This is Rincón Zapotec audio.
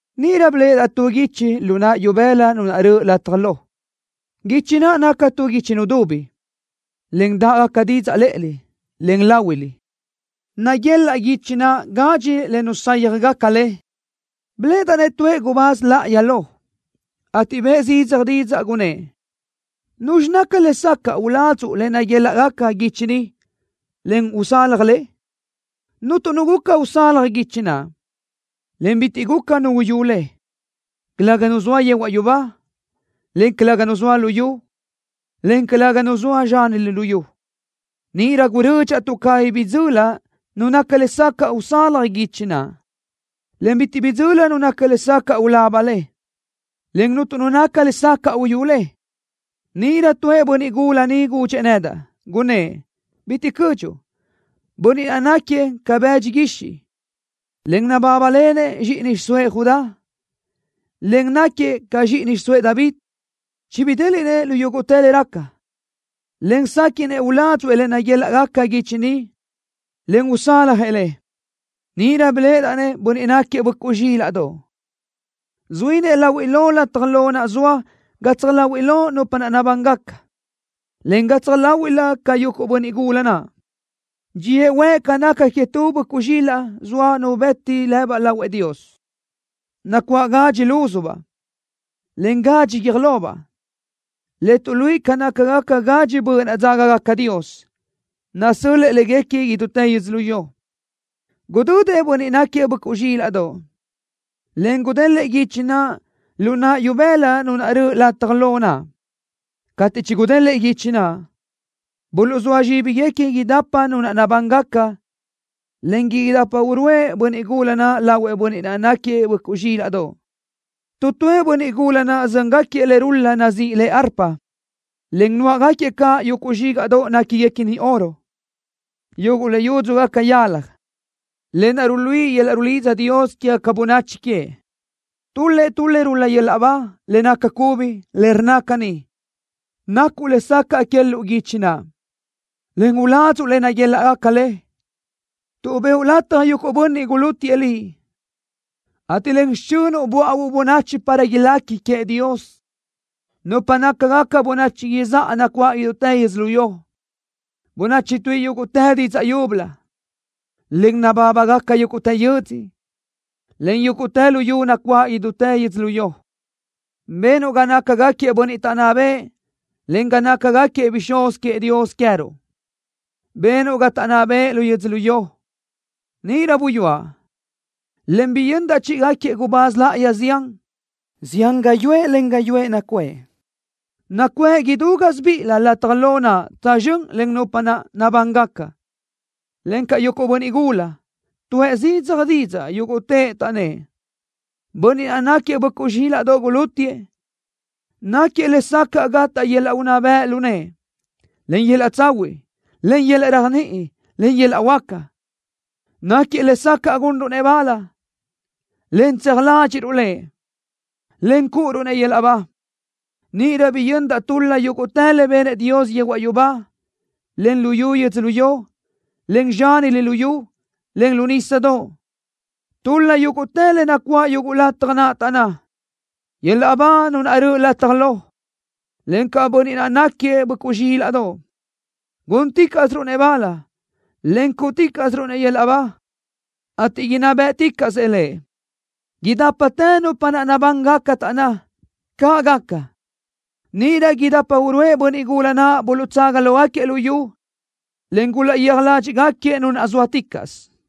Níʼirö biléʼedaʼ tu guichi lu naʼ ibëla Nu naʼ röʼö lataj lo. Guichi naʼ naca tu guichi nudubi, en dáʼgaca didzaʼ lë́ʼelö, en láhuilö. Naguelaʼ guichi naʼ gadxi le nusáyajgaca le. Biléʼedaʼ-nëʼ tuëʼ gubáz láʼayi lo, ateʼ bëʼë zidzaj didzaʼ, gunnë́ʼ: “¿Nuzxi naca lesacaʼ uladzuʼ le naguélaʼgaca guichi ni, en usalaj le?” Cuntu nu guca usalaj guichi naʼ, en bitiʼ guca nu uyú le, calëga nu zoa yehuaʼ yubá, en calëga nu zoa luyú, en calëga nu zoa zxánilö luyú. Níʼirö gurödxaʼ tuʼ cabí bidzöli nu naca lesacaʼ usalaj guichi naʼ, en bitiʼ bidzöli nu naca lesacaʼ ulaba le, en cuntu nu naca lesacaʼ uyú le. Níʼirö tuëʼ bönniʼ gula niʼ gudxëʼ nedaʼ, gunnë́ʼ: “Bitiʼ cödxuʼ. Bönniʼ naʼ náquiëʼ ca bëdxi guixiʼ, en nabábalenëʼ zxíʼini xiʼsóëʼ Judá, en náquiëʼ caʼ zxíʼini xiʼsóëʼ David, chibidéliʼnëʼ lu yúguʼtë le raca, en séquiʼnëʼ uládzuʼë le naguélaʼgaca guichi ni, en usálajëʼ le.” Níʼirö biléʼedaʼ-nëʼ Bönniʼ náquiëʼ Böʼcuʼ Zxílaʼdoʼ, zuínëʼ lahuiʼ lo lataj lo naʼ zoa gatsaj láhuiʼlö nupa naʼ nabángaca, en gatsaj láhuiʼlëʼ caʼ yuguʼ bönniʼ gula naʼ. Dxíëʼ huëʼ ca naca que tu böʼcuʼ zxilaʼ zoa nu bëti lëbaʼ lahuëʼ Dios, nacuáʼ gadxi lúzubaʼ, en gadxi guiö́j lobaʼ, le tuʼluíʼi ca nácagaca gadxi böʼ naʼ dzágagaca Dios, nasö́l-lëʼë léguequi idútë yödzölió. Gudödëʼ Bönniʼ náquiëʼ Böʼcuʼ Zxílaʼdoʼ, en gudélëʼë guichi naʼ lu naʼ ibëla Nu naʼ röʼö lataj lo naʼ. Cateʼ chigudélëʼë guichi naʼ, buluʼzóa zxíbiguequi idapa nupa naʼ nabángaca, en idapa uruʼë bönniʼ gula naʼ lahuëʼ Bönniʼ naʼ náquiëʼ Böʼcuʼ Zxílaʼdoʼ. Tu tuëʼ bönniʼ gula naʼ zö́ngaquiëʼ le rul-la nazíʼi le arpa, en nuáʼagaquiëʼ caʼ yuguʼ zxígaʼdoʼ néquiguequini oro, yuguʼ le yúdzugaca yalaj, lë naʼ ruluíʼi yöl-laʼ rulidza Dios quégaca bönachi queëʼ. Tul-lëʼ tu le rul-la yöl-laʼ ba, le naca cubi, le rnna caní: Nacuʼ lesacaʼ quéluʼu guichi naʼ, en uládzuʼu le naguélaʼgaca le, tuʼ bëʼu lataj yuguʼ bönniʼ gulútiëʼ Liʼ, ateʼ len xichönuʼ böáʼuuʼ bönachi para ilequi queëʼ Dios, nupa nácagaca bönachi izáʼa nacuáʼ idútë yödzölió, bönachi tuíʼi yúguʼtë didzaʼ yúbölö, en nabábagaca yúguʼtë yödzö, en yúguʼtë luyú nacuáʼ idútë yödzölió. Benuʼ ga nácagaquiëʼ bönniʼ taʼnná bëʼë en ga nácagaquiëʼ bixúz queëʼ Dios queë́ruʼ. Benuʼ ga taʼnná bëʼë lu yu yödzölió. Níʼirö buyúaʼ, en biyöndaʼ chíʼigaquiëʼ gubáz láʼayi zián. Zián gáyuʼë, en gáyuʼë nacuʼë. Nacuʼë idú gásibiʼilö lataj lo naʼ tsözxö́n len nupa naʼ nabángaca, encaʼ yuguʼ bönniʼ gula naʼ. Tuʼë zidzaj didzaʼ yúguʼtëʼ, taʼnnë́ʼ: ¡Bönniʼ naʼ náquiëʼ Böʼcuʼ Zxílaʼdoʼ gulútiëʼ, náquiëʼ lesacaʼ gataʼ yöl-laʼ unná bëʼ lu nëʼë, en yöl-laʼ tsahuiʼ, en yöl-laʼ réajniʼi, en yöl-laʼ huáca! ¡Náquiëʼ lesacaʼ gunruʼ-nëʼ bal, en tseaj ládxiʼruʼ Lëʼ, en cúʼuruʼ-nëʼ yöl-laʼ ba! Níʼirö biyöndaʼ tul-la yúguʼtë le benëʼ Dios yehuaʼ yubá, en lu yu yödzölió, en zxánilö luyú, en lu nísadoʼ. Tul-la yúguʼtë le nacuáʼ yuguʼ lataj naʼ, taʼnná: ¡Yöl-laʼ ba Nu naʼ röʼö lataj lo, encaʼ Bönniʼ naʼ náquiëʼ Böʼcuʼ Zxílaʼdoʼ! ¡Gúnticaʼsiruʼ-nëʼ bal en cúʼuticaʼsiruʼ-nëʼ yöl-laʼ ba, ateʼ inná bë́ʼticaʼsëʼ Lëʼ! Idápatë nupa naʼ nabángaca taʼnná: “¡Caʼ gaca!” Níʼirö idapa uruʼë bönniʼ gula naʼ buluʼtsaga lógaquiëʼ lu yu, en gulaʼyéaj ládxiʼgaquiëʼ Nu naʼ zóaticaʼsö.